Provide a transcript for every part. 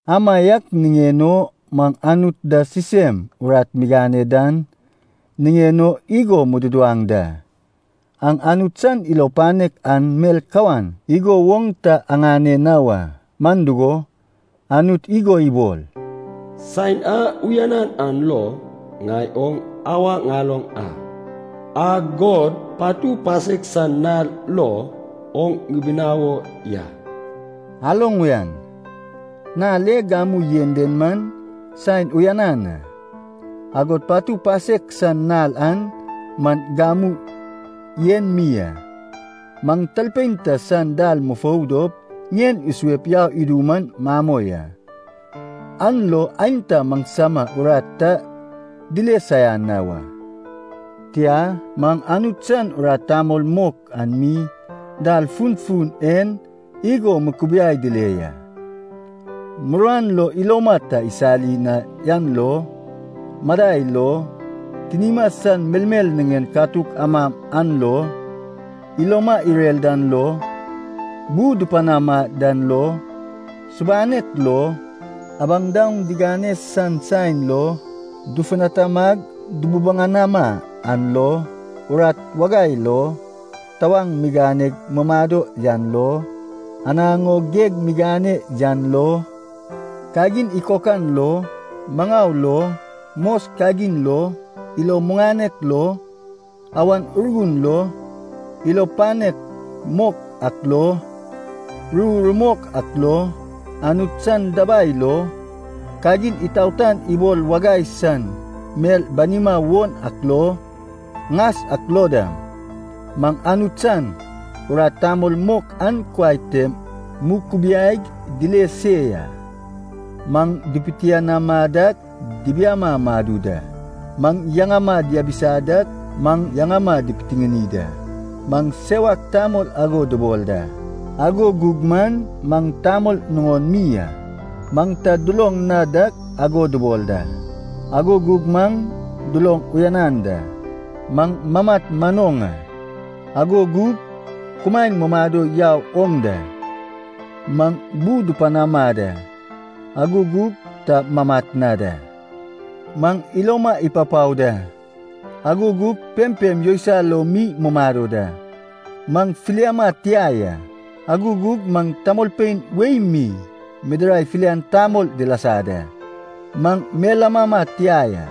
Amaiak niŋen o, maŋ Anut da sisem urat migane dan niŋen o igo mududuwaŋ da, aŋ Anut san ilo panek an mel kawan igo woŋ ta aŋane na wa. Man dugo, Anut igo ibol, “Saen a uyanan an lo ŋai oŋ awa ŋaloŋ a, agod patu pasek san nal lo oŋ ŋibinawo ya.” Aloŋ uyan, nal e gamu yen den man saen uyanan a, agod patu pasek san nal an man gamu en mi a. Maŋ talpein ta san dal mufou dop ŋien isuep yau idu man mamoi a, an lo aenta maŋsama urat ta dile saian na wa. Tia, maŋ Anut san urat tamol mok an mi dal funfun en igo mukubiaig dile ya. Muruan lo iloma ta isali na yan lo, madai lo, tinima san melmel niŋen katuk ama yan lo, iloma irer dan lo, bu dupanama dan lo, subanek lo, abaŋ daoŋ digane san saen lo dufutanamag dububuŋanama yan lo, urat wagai lo, tawaŋ miganeg mumado yan lo, anaŋ o geg migane yan lo, kagin ikokan lo, maŋau lo, mos kagin lo, ilo muŋanek lo, Awan Urgun lo, ilo panek mok ak lo, ru rumok ak lo, Anut san dabai lo, kagin itaotan ibol wagai san mel banima won ak lo, ŋas ak lo dam, maŋ Anut san urat tamol mok an kuai tem mukubiaig dile se ya. Maŋ dipitianama dak, dibiama madu da. Maŋ yaŋama diabisa dak, maŋ yaŋama dipitiŋini da. Maŋ sewak tamol ago dubol da, ago gug man maŋ tamol nuŋon mi a. Maŋ ta duloŋ na dak ago dubol da, ago gug maŋ duloŋ uyanan da. Maŋ mamat manoŋ a, ago gug kumaen mumado yau oŋ da. Maŋ bu dupanama da, ago gug ta mamat na da. Maŋ iloma ipapao da, ago gug pempem yousai lo mi mumado da. Maŋ filiama tia ya, ago gug man tamolpein wei mi midirai filian tamol dilasa da. Maŋ mel amama tia ya,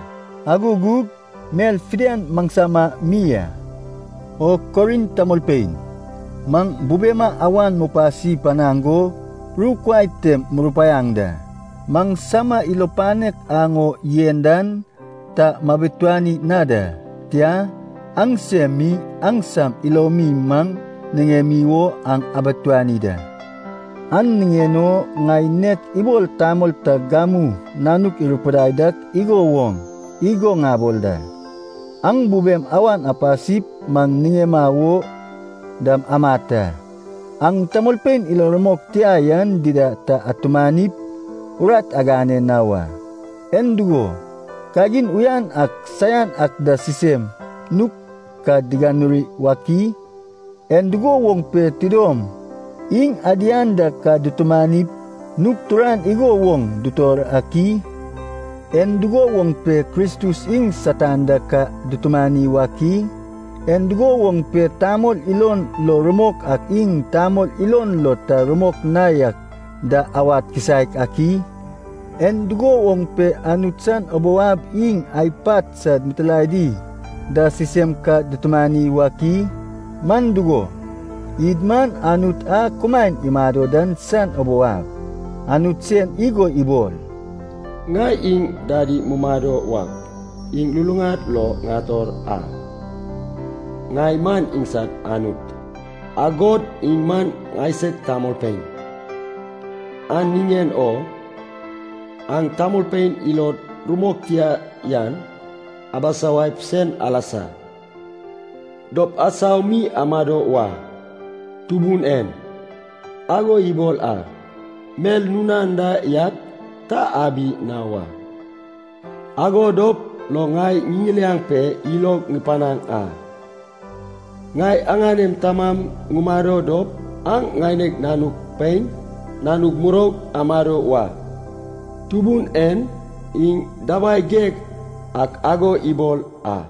ago gug mel fidian maŋsama mi a. O Korint tamolpein, maŋ bubema awan mupasi panaŋ go ru kuai tem murupaiaŋ da. Maŋsama ilo panek aŋ o yen dan ta mabituani na da. Tia, aŋsem mi aŋsam ilomi maŋ niŋem o an abituani da. An niŋen o ŋai nek ibol tamol ta gamu nanuk irupidai dak igo woŋ igo ŋabol da, aŋ bubem awan apasip maŋ niŋema wo dam amat a. Aŋ tamolpein ilo rumok tia yan dida ta atumanip, urat agane na wa. En dugo, kagin uyan ak saian ak da sisem nug ka diganuri wak i? En dugo woŋ pe tidom iŋ adian da ka dutumanip nug turan igo woŋ dutor ak i? En dugo woŋ pe Kristus iŋ Satan da ka dutumani wak i? En dugo woŋ pe tamol ilon lo rumok ak iŋ tamol ilon lo ta rumok na yak da awad kisaek ak i? En dugo woŋ pe Anut san ubou ab iŋ ai pat sad mitilaedi da sisem ka dutumani wak i? Man dugo, id man Anut a kumaen imado dan san ubou ab. Anut sen igo ibol, “Ŋai iŋ dadi mumado wak, iŋ luluŋad lo ŋator a. Ŋai man iŋsad Anut, agod iŋ man ŋaisag tamolpein.” “An niŋen o aŋ tamolpein ilod rumok tia yan abisawaip sen alasa dop asau mi amado wa. Tubun en ago ibol a. Mel nun anda yak ta abi na wa, ago dop lo ŋai ŋiŋiliaŋ pe ilog ŋupanaŋ a. Ŋai aŋanem Tamam ŋumado dop aŋ ŋaineg nanug pein, nanug muroug amado wa. Tubun en iŋ Dabai Geig ak ago ibol a.”